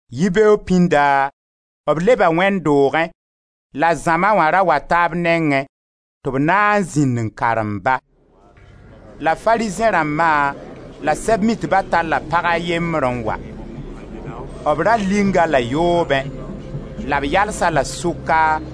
Yibeoog pĩnda, b leba wẽnd doogẽ la zãma wã ra wata b nengẽ tɩ b na n zĩnd n karem-ba. La Farizẽ rãmba la Sɛb-mitba talla pag a yembr n wa; b ra ling-a-la yoobẽ, la b yals-a la sʋka,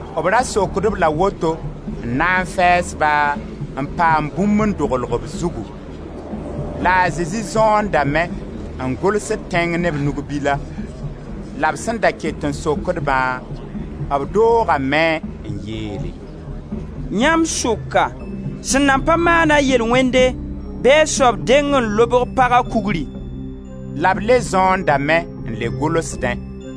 B ra sokd-b la woto n na fɛɛs-ba, n paam bũmb n dogl b zugu. La a Zezi zõondame n gʋlsd tẽng ne b nug-bila. La b sẽn da ket n sokd-bã, b doogame n yeele: «Yãmb sʋka sẽn nan pa maana yel-wẽnde, bɩ a soab deng n lobg paga kugri!» La b le zõondame n le gʋlsdẽ.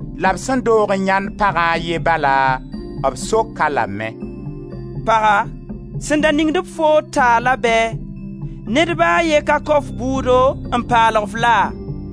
La b sẽn doog n yãend pagã a ye bala, b sok-a lame: «Paga, sẽn da ningd-b foo taala bɛɛ? Ned ba a ye ka kao f bʋʋdo n paalg-f laa?»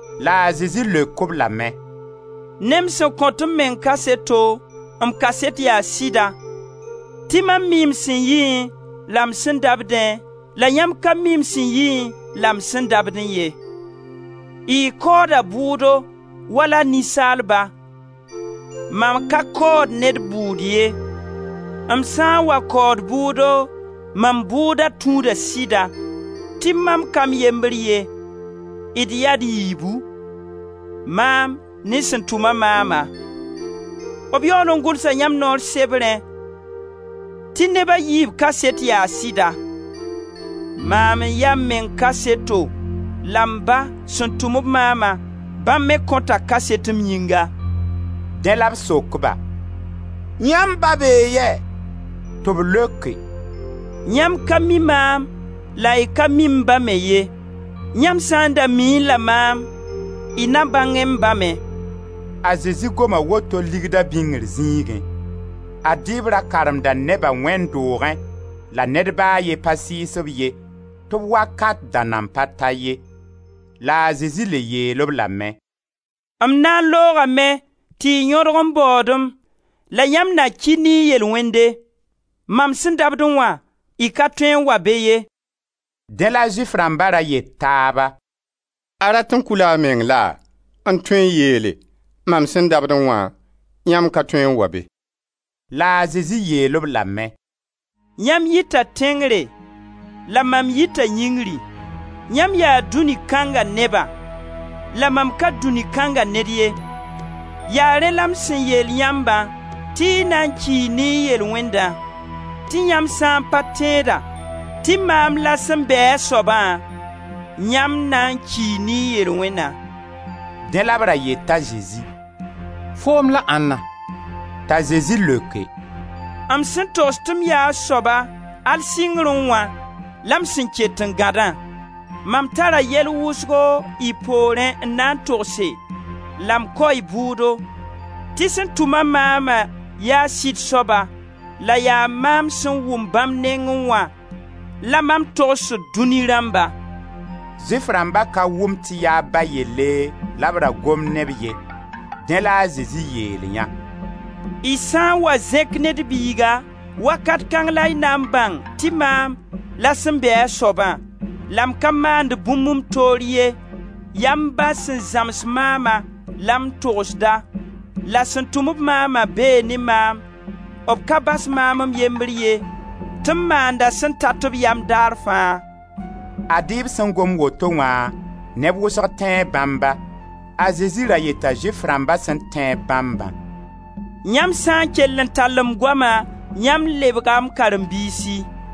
La a Zezi leok-b lame: «Ne m sẽn kõt m meng kaseto, m kaset yaa sɩda, tɩ mam mii m sẽn yiẽ, la m sẽn dabdẽ la yãmb ka mi m sẽn yiẽ la m sẽn dabdẽ ye. Y kaooda bʋʋdo wala ninsaalba, mam ka kaood ned bʋʋd ye; m sã n wa kaood bʋʋdo, mam bʋʋda tũuda sɩda, tɩ mam ka m yembre ye, d yaa d yiibu: maam ne sẽn tʋm-a maama. B yaool n gʋlsa yãmb noor sebrẽ tɩ neb a yiib kaset yaa sɩda. Maam n ya m meng kaseto, la m Ba sẽn tʋm-b maama, bãmb me kõta kaset m yĩnga.» Dẽ la b sok-ba: «Yãmb Ba bee yɛ?» Tɩ b leoke: «Yãmb ka mi maam la y ka mi m Ba me ye; yãmb sã n da miẽ-la maam y na bãngẽ m Ba me.» A Zezi goma woto ligda bĩngr zĩigẽ. Ad-y b ra karemda neba wẽnd doogẽ la ned ba a ye pa sɩɩs b ye tɩ b wakat da nan pa ta ye. La a Zezi le yeel-b lame: «M na n loogame tɩ y yõdg n baood-m, la yãmb na ki ne y yel-wẽnde. Mam sẽn dabdẽ wã, y ka tõe wa be ye.» Dẽ la Zʋɩf rãmba ra yet taaba: «A rat n kʋ-la a meng laa, n tõe yeele: ‹Mam sẽn dabdẽ wã yãmb ka tõe n wa be?›» La a Zezi yeel-b lame: «Yãmb yita tẽngre, la mam yita yĩngri. Yãmb yaa dũni kãnga neba; la mam ka dũni kãnga ned ye. Ya rẽ la m sẽn yeel yãmbã tɩ y na n kii ne y yel-wẽndã. Tɩ yãmb sã n pa tẽeda tɩ maam la sẽn bɛɛ-a soabã, yãmb na n kii ne y yel-wẽna.» Dẽ la b ra yeta Zezi: «Foom la ãnna?» T'a Zezi leoke: «M sẽn togs tɩ m ya a soaba al sɩngrẽ wã la m sẽn ket n gãdã. Mam tara yɛl wʋsgo y poorẽ n na n togse, la m kao y bʋʋdo, tɩ sẽn tʋm-a maama, yaa sɩd soaba, la yaa mam sẽn wʋm bãmb nengẽ wã la mam togsd dũni rãmba.» Zʋɩf rãmba ka wʋm tɩ yaa b Ba yelle la b ra gomd ne b ye. Dẽ la a Zezi yeelyã: «Y sã n wa zẽk Ned Biiga, wakat kãng la y na n bãng tɩ maam la sẽn bɛɛ-a soabã, la m ka maand bũmb m toor ye, yaa m Ba sẽn zãms maama, la m togsda, la sẽn tʋm-b maama bee ne maam, b ka bas maam m yembr ye, tɩ m maanda sẽn tat b yam dar fãa.» Ad-y b sẽn gom woto wã neb wʋsg tẽe bãmba. A Zezi ra yeta Zʋɩf rãmba sẽn tẽe-b bãmbã: «Yãmb sã n kell n tall m goama, yãmb lebga m karen-biisi.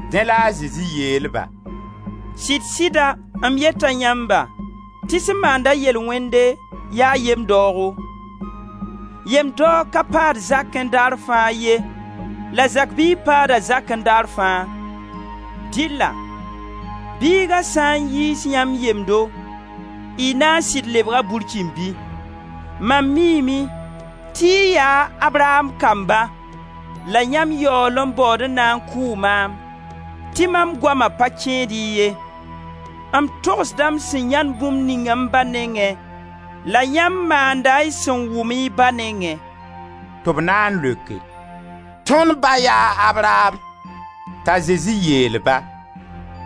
Dẽ la a Zezi yeel-ba: «Sɩd-sɩda m yeta yãmba, tɩ sẽn maand-a yel-wẽnde, yaa yem-daoogo. Yem-daoog ka paad zakẽ daar fãa ye la zak biig paada zakẽ daar fãa. Dɩlla Biiga sã n yiis yãmb yemdo, y naa n sɩd lebga burkĩmbi. Mam miime tɩ y yaa a Abraam kamba, la yãmb yaool n baood n na n kʋʋ maam, tɩ mam goama pa kẽed-y ye. M togsda m sẽn yãend bũmb ning m Ba nengẽ, la yãmb maanda y sẽn wʋm y ba nengẽ.» Tɩ b na n leoke: «Tõnd ba yaa Abraam.» T'a Zezi yeel-ba: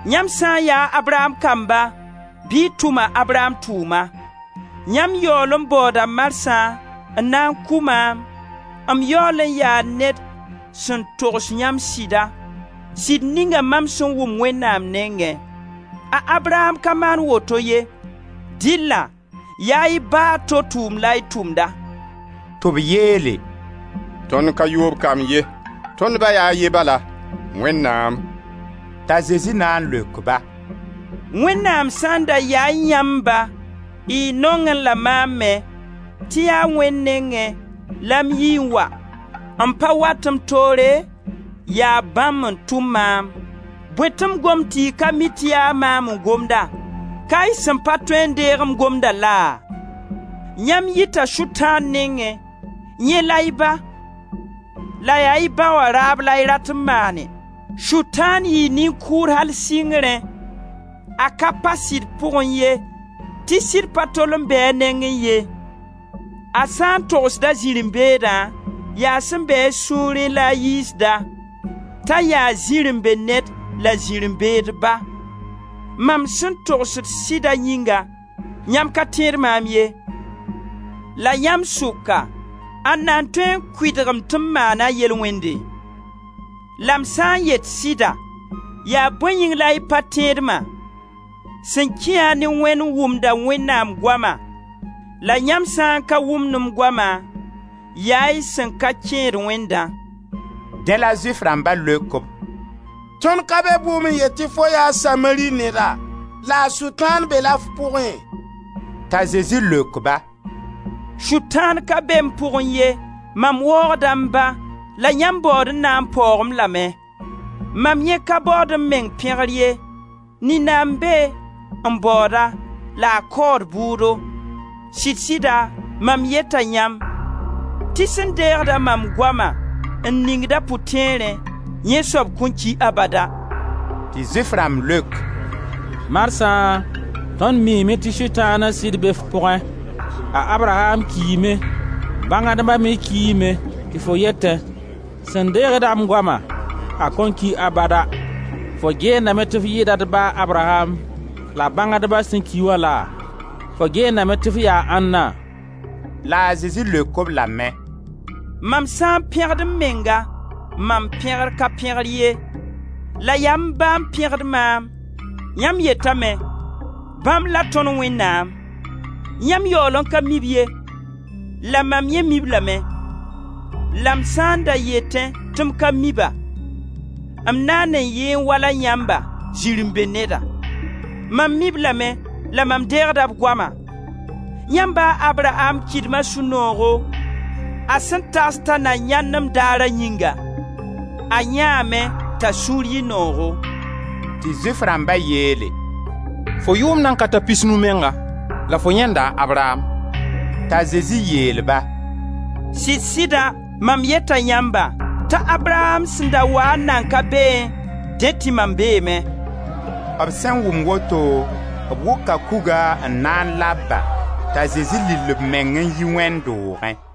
«Yãmb sã n yaa Abraam kamba bɩ y tʋm a Abraam tʋʋma. Yãmb yaool n baooda marsã n na n kʋ maam, m yaool n yaa ned sẽn togs yãmb sɩda, sɩd ninga mam sẽn wʋm Wẽnnaam nengẽ. A Abraam ka maan woto ye! Dɩlla yaa y ba a to tʋʋm la y tʋmda.» Tɩ b yeele: «Tõnd ka yoob kamb ye, tõnd Ba yaa a ye bala: Wẽnnaam.» T'a Zezi na n leok-ba: «Wẽnnaam sã n da yaẽ yãmb ba, y nongẽ la maam me, tɩ yaa Wẽnd nengẽ la m yii n wa; m pa wat m toore, yaa bãmb n tʋm maam. Bõe tɩ m gomd tɩ y ka mi tɩ yaa maam n gomda? Ka y sẽn pa tõe n deeg m gomda laa? Yãmb yita Sʋtãan nengẽ, yẽ la y ba, la yaa y ba wã raab la y rat n maane. Sʋtãan yɩɩ nin-kʋʋd al sɩngrẽ, a ka pa sɩd pʋgẽ ye, tɩ sɩd pa tol n be a nengẽ ye: a sã n togsd a zirẽ-beedã, yaa sẽn be a sũurẽ la a yiisda, t'a yaa zirẽ-be-ned la zirẽ-beed ba. Mam sẽn togsd sɩda yĩnga, yãmb ka tẽed maam ye. La yãmb sʋka, ãnna n tõe n kʋɩdg-m tɩ m maana yel-wẽnde? La m sã n yet sɩda, yaa bõe yĩng la y pa tẽed-ma? Sẽn kĩ-a ne Wẽnd, wʋmda Wẽnnaam goama, la yãmb sã n ka wʋmd m goama, yaa y sẽn ka kẽed Wẽndã.» Dẽ la Zʋɩf rãmba leok-b: «Tõnd ka be bʋʋm n yet tɩ fo yaa Samari neda la Sʋtãan be-la f pʋgẽ?» T'a Zezi leok-ba: «Sʋtãan ka be m pʋgẽ ye, mam waoogda m Ba, la yãmb baood n na n paoog-m lame. Mam yẽ ka baood m meng pẽgr ye; nina n be n baood-a la a kaood bʋʋdo. Sɩd-sɩda mam yeta yãmb, tɩ sẽn deegd-a mam goama n ning a pʋtẽerẽ, yẽ soab kõn ki abada.» Tɩ Zʋɩf rãmb leok: «Marsã tõnd miime tɩ Sʋtãan sɩd be f pʋgẽ. A Abraam kiime, bãngdba me kiime tɩ fo yetẽ: ‹Sẽn deegd-a m goama, a kõn ki abada.› Fo geendame tɩ f yɩɩda d ba a Abraam la bãngdbã sẽn ki wã laa? Fo geendame tɩ f yaa ãnna?» La a Zezi leok-b lame: «Mam sã n pẽgd m menga, mam pẽgr ka pẽgr ye; la yaa m Ba n pẽgd maam, yãmb yetame: ‹Bãmb la tõnd Wẽnnaam.› Yãmb yaool n ka mi-b ye; la mam yẽ mi-b lame; la m sã n da yetẽ tɩ m ka mi-ba, m naan n yɩẽ wala yãmba: zirẽ-be-neda. Mam mi-b lame la mam deegda b goama. Yãmb ba a Abraam kɩdma sũ-noogo, a sẽn tags ta na yãend m daara yĩnga. A yãeeme, t'a sũur yɩ noogo.» Tɩ Zʋɩf rãmba yeele: «Fo yʋʋm nan ka ta pisnu menga la fo yãenda a Abraam!» T'a Zezi yeel-ba: «Sɩd-sɩda mam yeta yãmba, t'a Abraam sẽn da waa n nan ka beẽ, dẽ tɩ mam beeme.» B sẽn wʋm woto, b wʋka kuga n na n lab-ba, t'a Zezi lill b meng n yi wẽnd doogẽ.